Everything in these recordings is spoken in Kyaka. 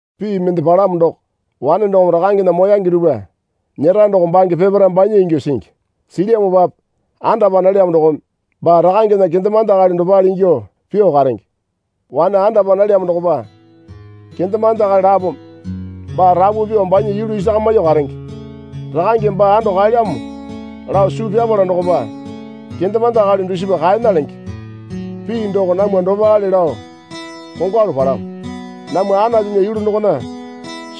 Pii mende palamo doko, wane dokome rakangena moyange dupwa nyera doko bange peparae banya ingyuo singi. Silyamopape andapa nalyamo dokome baa rakangena kendemande akali dopale ingyuo pyuo karenge. Wane andapa nalyamo dokopa kendemande akali lapome baa rapu pyuo banya yulu isakamyuo karenge. Rakangeme baa ando kaelyamo lao suu pyapala dokopa kendemande akali dusipa kaena lenge. Pii doko namwa dopale lao kongwalu palamo. Namwa Anatunya yulu dokona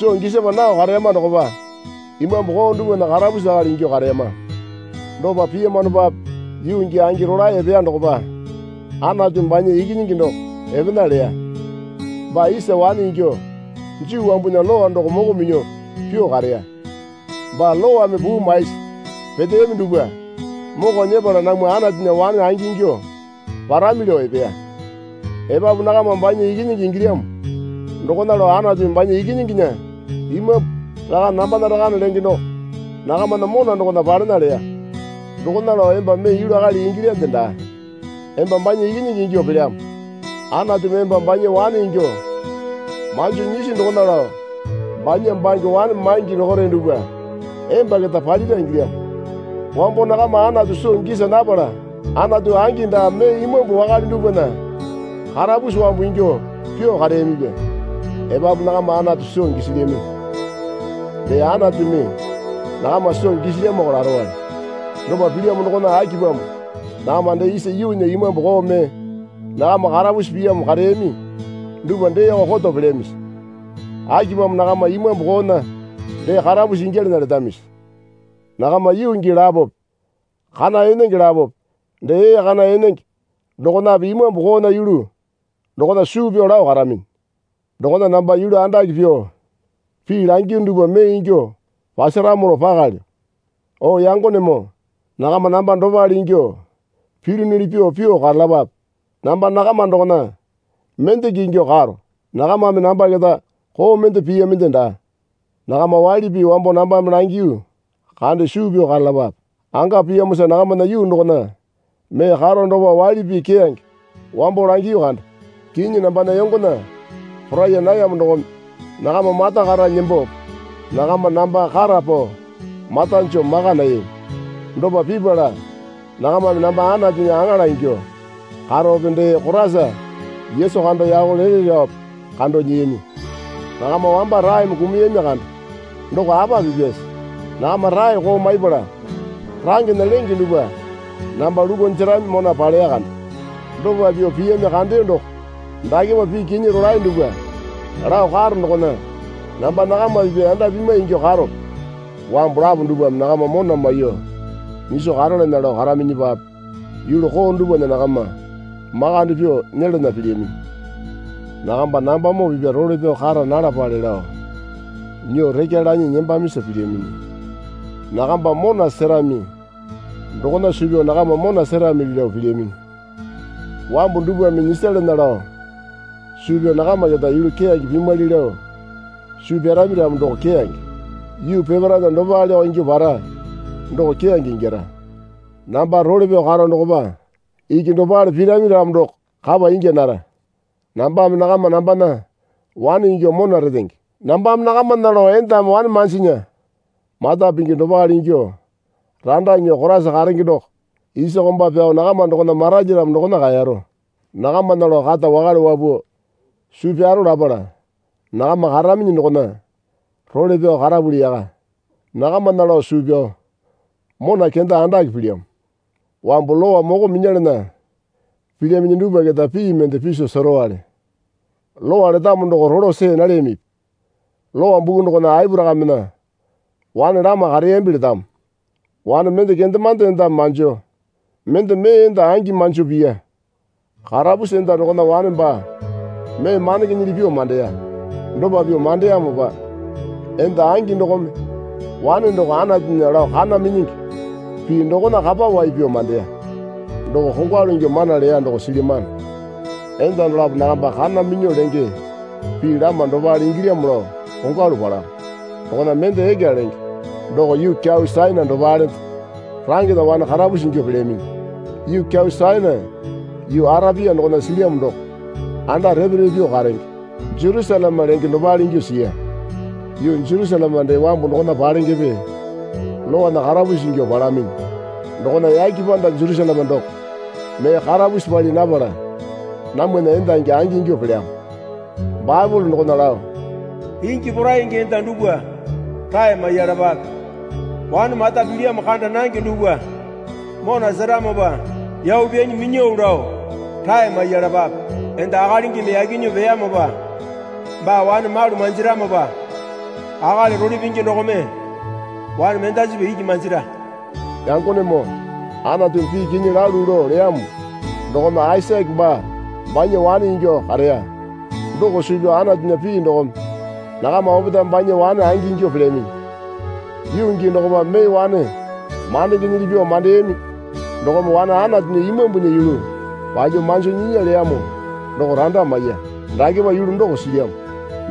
soo gisapa nao kareyama dokopa imambu koo dupwana karapusi akali ingyuo kareyama. Dopa piyamanopape yuu gii angi rolae epeya dokopa Anatumi banya Ikinyingi doko epena leya. Baa isa wane ingyuo Juu wambunya Lowa doko moko minyuo pyuo kareya. Baa Lowame puu maisi peteyami dupwa moko nyepala namwa Anatunya wane angingyuo parami lao epeya. Epapu nakama banya Ikinyingi ingilyamo dokona lao Anatumi banya Ikinyinginya Imambu, Rakane nambana rakane lenge doko nakamana mona dokona palena leya. Dokona lao emba mee yulu akali ingilyande daa. Emba banya ikinyingi ingyuo pelyamo. Anatumi emba banya wane ingyuo manjo nyisi dokona lao banya bange wane maingi dokore dupwa emba keta palira ingilyamo. Wambo nakama Anatu soo gisa napala anatu angi daa mee imambu wakale dupwana karapusi wambu ingyuo pyuo kareyamipya. Epapu nakama Anatu soo gisilyaminyi. Dee Anatumi nakama soo gisilyamoko larowale. Dopa pilyamo dokona akipamo nakama dee isa yuunya imambu koo mee nakama karapusi piyamo kareyami dupwa deeko koto pelyamisi? Akipamo nakama imambu koona dee karapusi ingyalana letamisi? Nakama yuu gii lapope kana enenge lapope dee ee kana enenge dokonape imambu koona yulu dokona suu pyao lao karaminyi. Dokona namba yulu andake pyuo pii langiyunu dupwa mee ingyuo pasaramo lao pakalyo. O yangonemoo nakama namba dopale ingyuo pilyunuli pyuo pyuo karalapape. Namba nakama dokona mendeke ingyuo karo. Nakamame namba keta koo mende piyaminde daa. Nakama waili pii wambo nambame langiyu kande suu pyao karalapape. Anga piyamosa nakamana yuu dokona mee karo dokopa waili pii keyange wambo langiyu kande. Kinyi nambana yongona poraiya nayamo dokome nakama mata kata nembope nakama namba kata pao mata joo maka nayami. Dopa pipala nakamame namba Anatunya aŋala ingyuo karope dee Koraisa Yesu kando yako lele laope kando nyiyami. Nakama wamba raeme kumuyami kande. Doko apa pipyase? Nakama rae koo maipala rangena lenge dupwa namba lukuo jerami mona paleya kande. Dopa pyuo piyami kandeyo doko dakepa pii kinyi rolae dupwa lao karo dokona namba nakama pipya yanda pimwai ingyuo karope? Wambu lapo dupwame nakama mona maiyuo nyiso karalana lao karaminyipape yulu koo dupwana nakama makande pyuo nyelana pilyaminyi. Nakamba nambamoo pipya role pyao kara nalapale lao nyuo rekya lanyi nembamisa pilyaminyi. Nakamba mona serami dokona suu pyao nakama mona seramili lao pilyaminyi. Wambu dupwame nyisalana lao suu pyao nakama keta yulu keyange pimwali lao suu pyarami ramo doko keyange. Yuu peparaena dopaleko ingyuo para doko keyange ingyara. Namba role pyao karo dokopa iki dopale pirami ramo doko kapa inya nara. Nambame nakama nambana wane ingyuo mona retenge. Nambame nakamana lao endame wane manjinya mata pingi dopale ingyuo randa nyuo Koraisa karenge doko isa komba pyao nakama dokona maralyaramo dokona kaero. Nakamana lao kata wakale wapuo suu pyaro lapala nakama karaminyi dokona role pyao karapuli yaka. Nakamana lao suu pyao mona kenda andake pilyamo. Wambu Lowa moko minyalana pilyaminyi dupwa keta pii mende piso serowale. Lowa letamo doko rolo see nalyamipi? Lowa buku dokona Aporakamena wane lama kareyambi letamo. Wane mende kendemande endame manjo mende mee enda angi manjo piya. Karapusi enda dokona wane baa mee mandengenyili pyuo mandeya. Dopa pyuo mandeyamopa enda angi dokome wane doko Anatunya lao kana minyingi pii dokona kapa wai pyao mandeyo. Doko kongwalu ingyuo mana leya doko silyamano. Enda dolapo nakamba kana minyuo lenge pii lama dopale ingilyamo lao kongwalu palamo. Dokona mende Eka lenge doko yuu kyau Sainai dopalende rangena wane karapusi ingyuo pelyaminyi. Yuu kyau Sainai yuu Arapia dokona silyamo doko anda repe repe pyuo karenge Jerusaleme lenge dopale ingyuo siya. Yuu Jerusaleme dee wambu dokona palengepe lowana karapusi ingyuo palaminyi. Dokona yake panda Jerusaleme doko mee karapusi pali napala namwana endangi angingyuo pelyamo. Baepole dokona lao. Ingi poraingi enda dupwa rae maiyalapape. Wane mata pilyamo kanda nange dupwa mona seramopa yau pyanyi minyao lao rae maiyalapape. Enda akalingimi yaki nyuo peyamopa baa wane malu manjiramopa akali role pingi dokome wane mendasipa iki manjira. Yangonemoo Anatumi pii kinyi lalu lao leyamo dokome Aisake baa banya wane ingyuo kareya doko suu pyao Anatunya pii dokome nakama opetae banya wane angingyuo pelyaminyi. Yuu gii dokopa mee wane mandengenyili pyuo mandeyami dokome wane Anatunya Imambunya yulu palyuo manjo nyinya leyamo doko randa maiya. Dakepa yulu doko silyamo.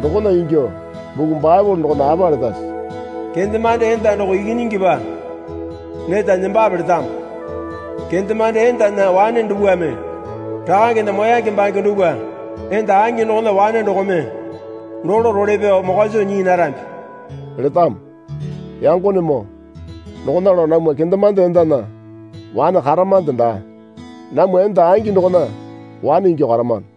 Dokona ingyuo buku Baepole dokona apa letase? Kendemande enda doko ikinyingipa neta nembape letamo. Kendemande endana wane dupwame rakangena moyange bange dupwa enda angi dokona wane dokome dolo role pyao mokwa soo nyii narambi letamo. Yangonemoo dokona lao namwa kendemande endana wane karamande daa. Namwa enda angi dokona wane ingyuo karamano.